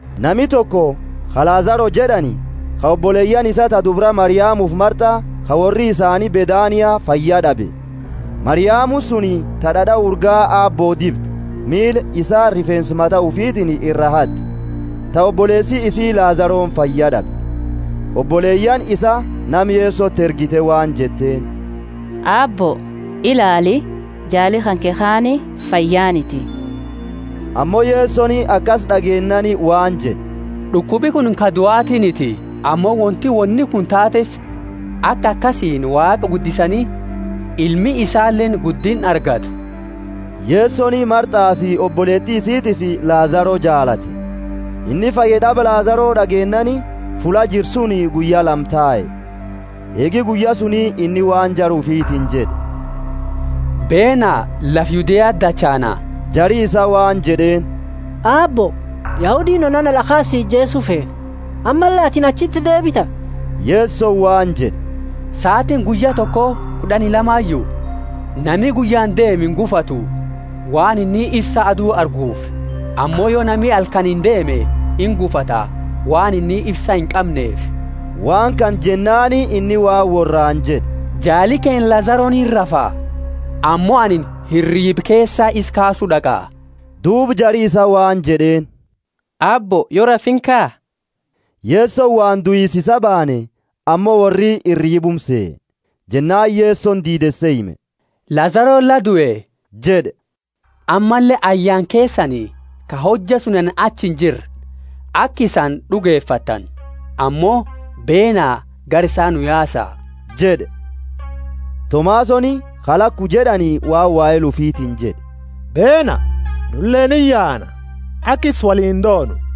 Nami toko, ka Lazaro jed'ani, ka oboleyaani isaa ta dubra Mariamufi Martha, ka worri isaani Bethania fayyad'abe. (Mariamuni suni ta d'ad'a urgaa Aabbo dibde, miila isaa rifeensa mata ufiitini ira haat'e, ta oboleesi isii Lazaroni fayyad'abe.) Oboleyaani isaa nama Yesoti ergite waan jetteeni, Aabbo, ilaali, jaali kanke kaani fayyaaniti. Ammo Yesoni akasi d'ageennaani waan jed'e, d'ukubi kunini ka duatiniti, ammo wonti woni kunini taateefi aka akasiini Waaqa guddisani ilmi isaaleeni guddinna argattu. Yesoni Marthafi oboleeti isitiifi Lazaro jaalate. Inni fayyad'aba Lazaro d'ageennaani, fulla jiru suni guyya lama tae. Eegi guyya suni inni waan jara ufiitini jed'e, Beena, lafa Yudeati dachaana. Jari isaa waan jed'eeni, Aabbo, Yahudiini onana d'akhaani si ijeesu feete, ammalle atini achiti deebita? Yesoni waan jed'e, Saatiini guyya toko kud'ani lamayu? Nami guyyaani deemu ingufatu, waan inni ifsa adu arguufi. Ammo yo nami halkaniini deeme, ingufata, waan inni ifsa inqamneefi. Waan kana jennaani inni waan worraani jed'e, Jaali keenna Lazaroni hirrafa, ammo anini hiriiba keesaa isa kaasu d'aqa. Duuba jari isaa waan jed'eeni, Aabbo, yo rafe, inkaa. Yesoni waan duisa isaa baane, ammo worri hiriibuma sehe. Jennaani Yesoni diideese hime, Lazaroni la due jed'e; ammalle ayyaana keesani, ka hojja suni anini achi injirre, aka isani d'ugefattani. Ammo beena, gara isaa nu yaasa jed'e. Tomasoni (ka Laku jed'ani) waan wahela ufitiini jed'e, Beena, nuleeni iyaana, aka isa woliini doonu.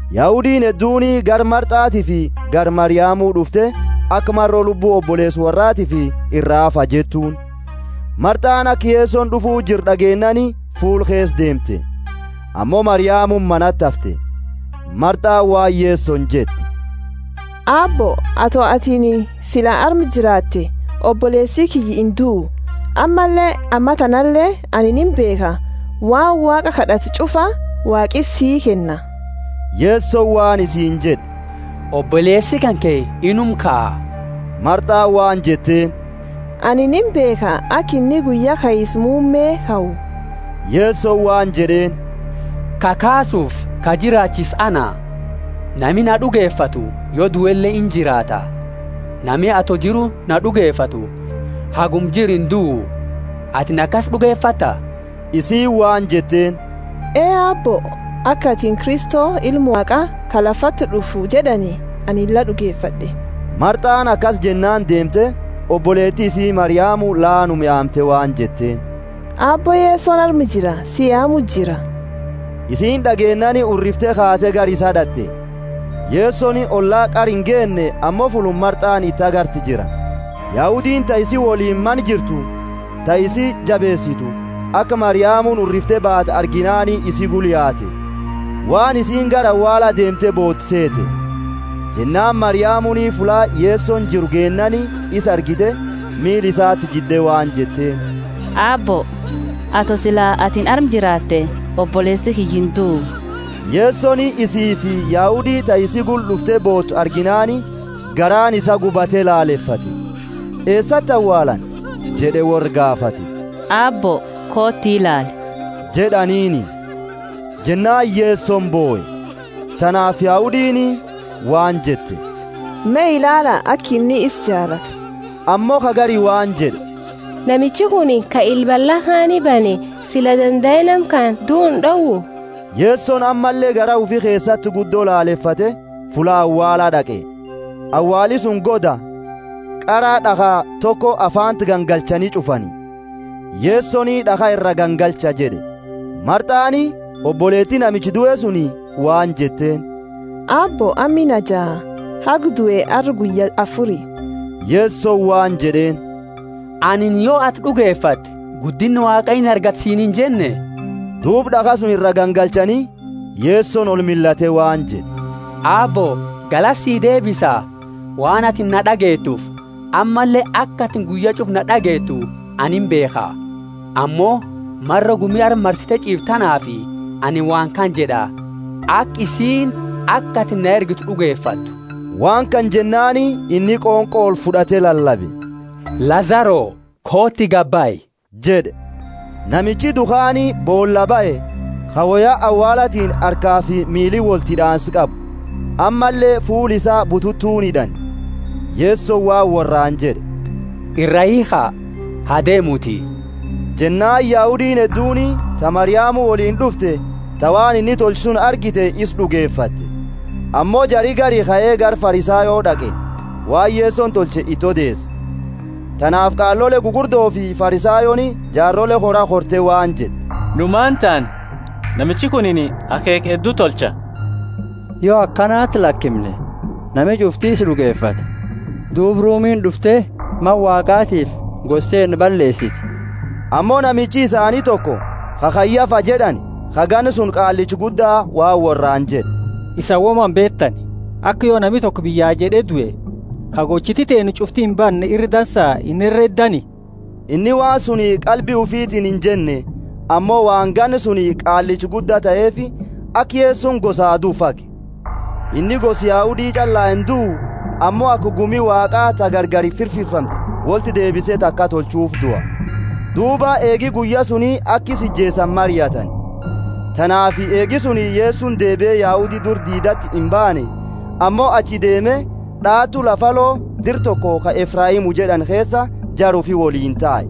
Yahudiini hedduuni gara Marthatiifi gara Mariamu d'ufte aka maro lubbu oboleesa worraatiifi iraa hafaa jettuuni. Marthani aka Yesoni d'ufu jiru d'ageennaani, fuula keesa deemte; ammo Mariamuni manati hafte. Marthani waan Yesoni jette, Aabbo, ato atini sila arma jiraate, oboleesi kiyya induu. Ammalle ammatanale ani imbeekha, waan Waaqa kad'atu ch'ufa Waaqi sii kenna. Yesoni waan isiini jed'e, Oboleesi kanke inuma kaa. Marthani waan jetteeni, Anini imbeekha aka inni guyya kaisa muumme kau. Yesoni waan jed'eeni, Ka kaasufi ka jiraachisu ana; nami na d'ugefatu, yo duele, injiraata. Nami ato jiru na d'ugefatu haguma jiru induu. Atini akasi d'ugefatta? Isiini waan jetteeni, Ee, Aabbo, aka atini Kristo, Ilma Waaqa, ka lafati d'ufu jed'ani, ani la d'ugefad'e. Marthani akasi jennaani deemte, oboleeti isii Mariamu laanuma yaamte waan jetteeni, Aabbo Yesoni arma jira, si yaamu jira. Isiini d'ageennaani hurrifte kaate gara isaa d'at'e. Yesoni olla qara ingeenne, ammo fulluma Marthani iti agarte jira. Yahudiini ta isii woliini mana jirtu, ta isi jabeesitu, aka Mariamuni hurrifte baate arginaani isi gula yaate, waan isiini gara awaala deemte bootu seete. Jennaani Mariamuni fulla Yesoni jiru geennaani isa argite, miila isati jidde waan jetteeni, Aabbo, ato sila atini arma jiraate oboleesi kiyya induu. Yesoni isiifi Yahudi ta isii gula d'ufte bootu arginaani, garaani isaa gubate lalefate. Eesati awaalani? jed'e worra gaafate. Aabbo, kooti, ilaali jed'aniini. Jennaani Yesoni bohe. Tanaafi Yahudiini waan jette, Me ilaala, aka inni isa jaalate! Ammo ka gari waan jed'e, Namichi kunini, ka ila balla kaani bane, sila dandae nama kana duu ind'owu? Yesoni ammalle garaa ufi keesati guddo lalefate, fulla awaala d'aqe. Awaali suni goda, qara d'akha toko afaanti gangalchani ch'ufani. Yesoni, D'akha iraa gangalcha jed'e. Marthani, oboleeti namicha due suni, waan jetteeni, Aabbo, amma inajaa, haga due arra guyya afuri. Yesoni waan jed'eeni, Anini, Yo ati d'ugefatte, guddinna Waaqa inagarta siini injenne? Duuba d'akha suni iraa gangalchani. Yesoni olmillate waan jed'e, Aabbo, galata sii deebisa, waan atini na d'ageetuufi. Ammalle aka atini guyya ch'ufa na d'ageetu ani imbeekha, ammo maro gumi arma marsite ch'iiftu tanaafi anini waan kana jed'a, aka isiini aka atini na ergite d'ugefattu. Waan kana jennaani inni qonqo olfud'ate lalabe, Lazaro, kooti, gabahi jed'e. Namichi due kaani boolaa bahe, ka woya awaalatiini harkafi miili wolti hid'aansa qabu, ammalle fuula isaa bututuuni hid'ani. Yesoni waan worraani jed'e, Iraa hiikha, ha deemuti. Jennaani Yahudiini hedduuni, ta Mariamu woliini d'ufte, ta waan inni tolche suni argite, isa d'ugefatte. Ammo jari gari kae gara Farisayo d'aqe, waan Yesoni tolche iti odeese. Tanaafi qaalole gugurdofi Farisayooni jaarole kora korte waan jette, Nu maani taana? Namichi kunini akheekha heddu tolcha. Yo akanati lakimne, nami ch'ufti isa d'ugefata, duuba Rumiini d'ufte Mana Waaqaatiifi gosa teenna balleesiti! Ammo namichi isaani toko, ka Kayafa jed'ani, ka ganna suni qaallicha gudda, waan worraani jed'e, Isani woma imbeetani; aka yo nami toko biyya jed'e due, ka gochiti teenna ch'ufti imbanne ira dansa inhereddani. Inni waan suni qalbi ufiitini injenne, ammo waan ganna suni qaallicha gudda taheefi, aka Yesoni gosaa duu fage. Inni gosa Yahudi ch'allaa induu, ammo aka gumi Waaqaa ta gargari firfirfamte wolti deebise taka tolchuufi dua. Duuba eegi guyya suni aka isa ijeesani mariatani. Tanaafi eegi suni Yesoni deebie Yahudi dura diidati imbaanne, ammo achi deeme, d'aatu lafa alo, dira toko ka Efraimu jed'ani keesa, jara ufi woliini tae.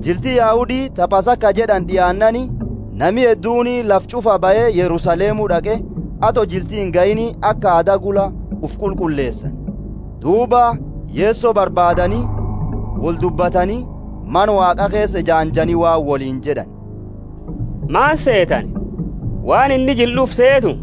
Jilti Yahudi ta Pasaka jed'ani d'iaannaani, nami hedduuni lafa ch'ufaa bahe Yerusalemu d'aqe, ato jilti ingahiini, aka aada gula ufi qulqulleesani. Duuba Yeso barbaadani woldubbatani, Mana Waaqa keesa ejaanjani waan woliini jed'ani, Maani seetani? Waan inni jila d'ufu seetu?